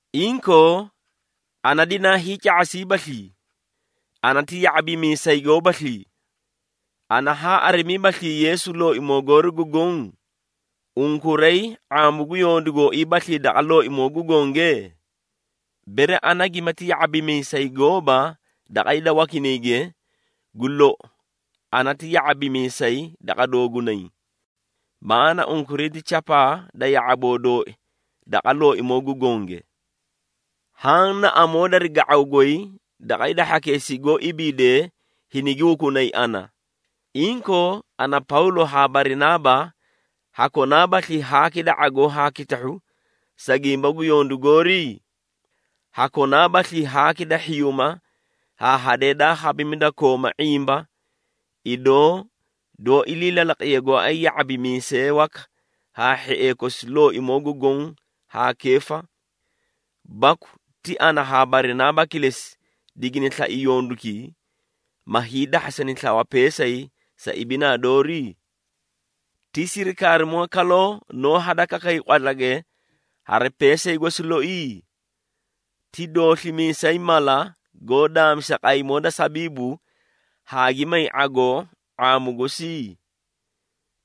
Inkoo, ana dinaa hiica⁄asiibaslii? Ana ti ya⁄abimiisay goobaslii? Ana haa arimiibaslii Yeesu, Looimoo goori gu Goõ? Unkuray ⁄aamu gu yondu gooiibaslii daqa Looimoo gu Gonge? Bere ana gimati ya⁄abimiisay gooba daqa hida wakinayge, gu lou ana ti ya⁄abimiisay daqa doogunay. Maꞌaana unkuray ti chapaa da ya⁄aboo dooi daqa Looimoo gu Gonge. Haã na amoo dari ga⁄aw goy daqa hida hhakeesii goó ibiidee hinigi hukunay ana. Inkoo, ana, Pawlo haa Barinaaba, hakonaabaslii haaki da ⁄agoo haa kitahhu, sa gimba gu yondu goori? Hakonaabaslii haaki da hhiyuuma haa hadee daa khabimi da kooma ⁄imba, idoo doó ilii lalaqiye gooay ya⁄abimiisee waka haa hhiee kosi Looimoo gu Goõ haa Keefa. Baku ti ana haa Barinaaba kilesi digini slai yondukii, ma hiidahhasani slawa peesay sa ibinaa doori? Ti sirikaarimoo kaloo noó hadakakay qwatlage hari peesay gosi loi? Ti dooslimiisay mala goó daamisa qaymoo da sabiibu haa gi may ⁄agoo ⁄aamu gosi?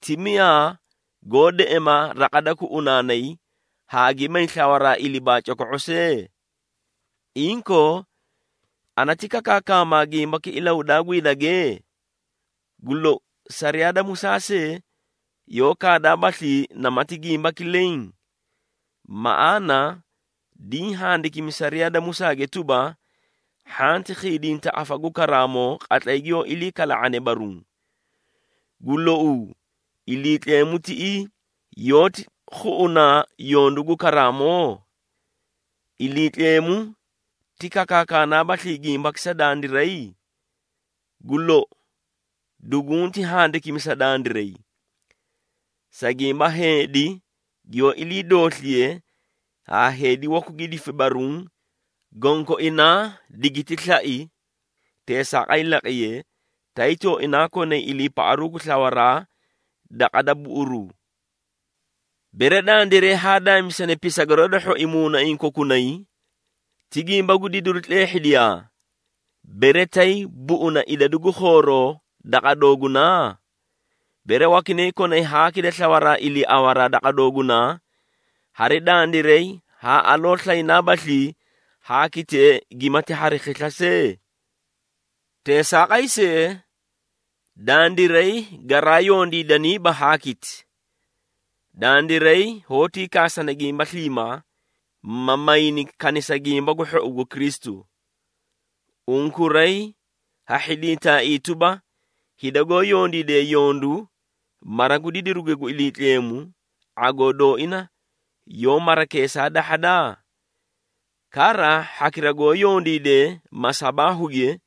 Ti miyaa goó deꞌema raqa da kuꞌunaanay haa gi may slawaraa ilibaa coko⁄o see? Inkoo, ana ti kakaakama gimbaki ilahudaa gu hidage? Gu lou, sariyaa da Musaa see yoó kaadaabaslii namati gimbaki leẽ? Maꞌaana diĩ handikimi sariyaa da Musaage tuba, “Hhanti khiidinta afa gu karaamoo qatlay giyoó ilii kala⁄ane baruũ.” Gu louu, Iliitleemu tiꞌii yoóti khuꞌunaa yondu gu karaamoo? Iliitleemu ti kakaakanaabaslii gimbaki sa dandiray? Gu lou, dugunti handikimi sa dandiray. Sa gimba heedi giyoó ilii doosliye haa heedi waku gi difi baruũ, gonkoinaa digiti slai, teesaaqay laqiyee, tay tooinaa konay iliipaꞌaru gu slawaraa daqa da buꞌuruu. Bere dandiray haa daamisani pisagaroo da hhoi muunaiĩ kokunay, ti gimba gu didiru tleehhidiyaa, bere tay buꞌuna idadu gu khooroo daqa doogunaa? Bere wakinay konay haaki da slawaraa iliiawaraa daqa doogunaa, hari dandiray haa aloo slaynaabaslii haakitee gimati hari khisla see? Teesaaqay see, dandiray garaa yondiidaniiba haakiti. Dandiray hoótii kaasana gimba sliimaa, ma mayni kanisa Gimba gu Hhou gu Kristu. Unkuray ha hhidintaaii tuba, hida goó yondiidee yondu mara gu didiruge gu Iliitleemu, ⁄agoo dooina yoó marakeesaa dahhada? Kara hhakira goó yondiidee masabaahuge,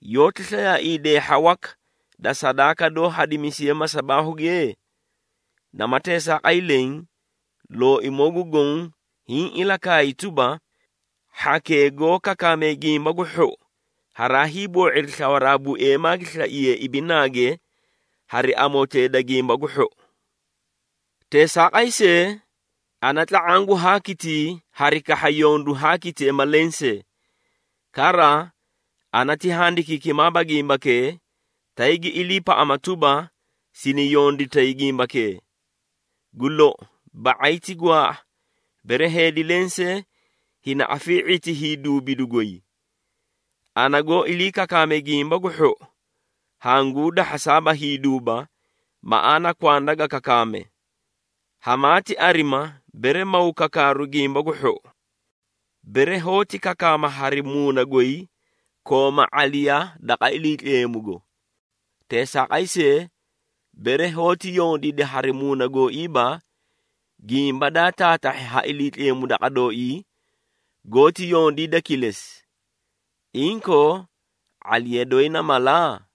yoóti slayaaii deehha waka da sadaaka doó hadimisiye masabaahuge? Nama teesaaqay leẽ, Looimoo gu Goõ hiĩ ilakaay tuba, hhakee goó kakaamee Gimba gu Hhou haraa hiiboo⁄iri slawaraa bueemaa gi slaiyee ibinaage hari amotee da Gimba gu Hhou. Teesaaqay see, ana tla⁄aã gu haakitii hari kahha yondu haakitee ma lensee. Kara, ana ti handikiikimaaba gimbakee, tay gi iliipaꞌama tuba, sini yonditay gimbakee. Gu lou, ba⁄ay ti gwaaꞌa, bere heedi lensee hini afii⁄iti hiiduubidu goy. Ana goó ilii kakaame Gimba gu Hhou, hanguu dahhasaaba hiiduuba, maꞌaana kwanda ga kakaame. Hamaati arima, bere maw kakaaru Gimba gu Hhou! Bere hoóti kakaama hari muuna goy, kooma ⁄aliya daqa Iliitleemugo. Teesaaqay see, bere hoóti yondiida hari muuna gooiiba, gimba daa taatahhi ha Iliitleemu daqa dooii, goóti yondiida kilesi. Inkoo, ⁄aliya doyi na mala?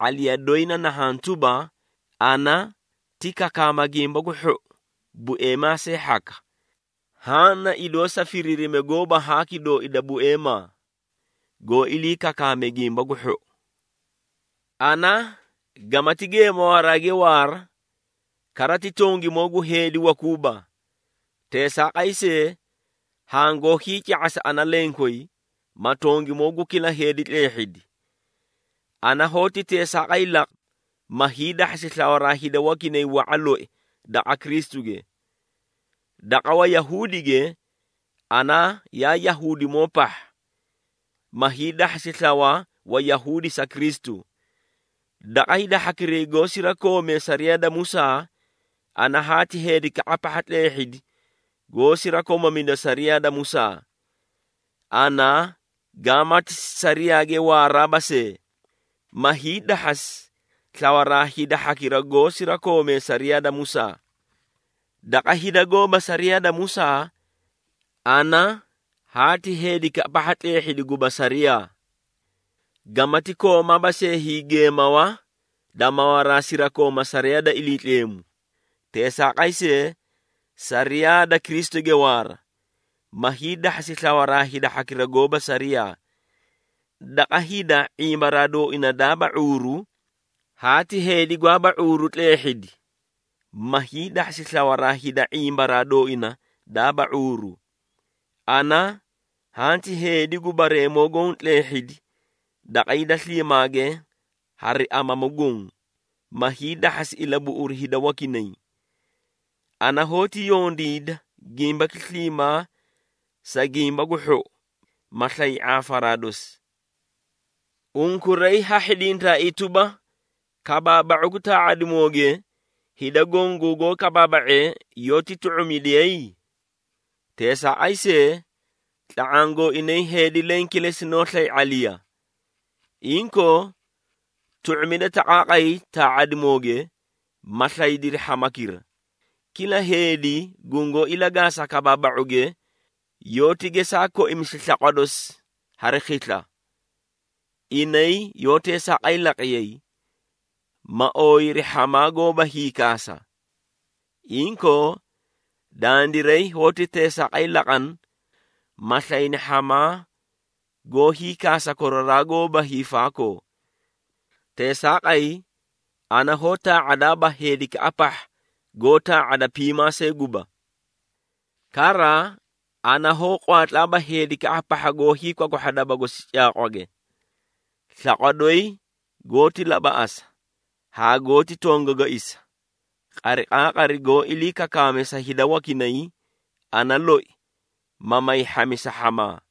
⁄aliya doyi na nahhaã tuba, ana ti kakaama Gimba gu Hhou bueemaa see hhaka. Haã na idoo sa firiirime gooba haaki dooi da bueemaa, goó ilii kakaamee Gimba gu Hhou. Ana gamati geemawaraage waara, kara ti tongimoo gu heedi wakuuba. Teesaaqay see, hangoó hiica⁄asa ana lenkoyi, ma tongimoo gu kila heedi tleehhidi. Ana hoóti teesaaqay laqa, ma hiidahhasi slawaraa hida wakinay wa⁄a loi daqa Kristuge. Daqa Wayahuudige, ana yaa Yahuudimoo pahha, ma hiidahhasi slawa Wayahuudi sa Kristu. Daqa hida hhakiray goó sirakoomee sariyaa da Musaa, ana haati heedikaꞌa pahha tleehhidi goó sirakomamida sariyaa da Musaa, (ana gaamati sariyaage waaraaba see), ma hiidahhasi slawaraa hida hhakira goó sirakoomee sariyaa da Musaa. Daqa hida goóba sariyaa da Musaa, ana haati heedikaꞌa pahha tleehhidi guba sariyaa, (gamati koomaaba see hiigeemawa da mawaraa sirakooma sariyaa da Iliitleemu, teesaaqay see sariyaa da Kristuge waara), ma hiidahhasi slawaraa hhakira goóba sariyaa. Daqa hida ⁄imbaraa dooina daaba ⁄uuru, haati heedi gwaaba ⁄uuru tleehhidi, ma hiidahhasi slawaraa hida ⁄imbaraa dooina daaba ⁄uuru. Ana hanti heedi gu bareemoo goõ tleehhidi daqa hida sliimaage hari amamu goõ, ma hiidahhasi ilabuꞌuru hida wakinay. Ana hoóti yondiida gimbaki sliimaa sa Gimba gu Hhou, ma slay ⁄aafaraa dosi. Unkuray ha hhidintaaii tuba, kabaaba⁄u gu taa⁄adimooge, hida goõ gungoó kabaaba⁄ee yoóti tu⁄umidiyay? Teesaaqay see, tla⁄aã gooinay heedi leẽ kilesi noó slay ⁄aliya. Inkoo, tu⁄umida taqaaqay taa⁄adimooge, ma slaydiri hhamakira. Kila heedi gungoó ilagaasa kabaaba⁄uge, yoóti gesaa koimisi slaqwa dosi hari khisla. Inay yoó teesaaqay laqiyay, ma ooyiri hhamaa goóba hiikaasa. Inkoo, dandiray hoóti teesaaqay laqana, ma slayni hhamaa goó hiikaasa koraraa goóba hiifaakoo. Teesaaqay, ana hoó taa⁄adaaba heedikaꞌa pahha goó tlaa⁄ada piimaa see guba. Kara ana hoó qwaatlaaba heedikaꞌa pahha goó hiikwakwahha daba gosi caaqwage. Slaqwa doyi goóti labaꞌasa haa goóti tongagaisa, qariqaaqari goó ilii kakaame sa hida wakinay, ana loi, ma may hhamisa hhamaa.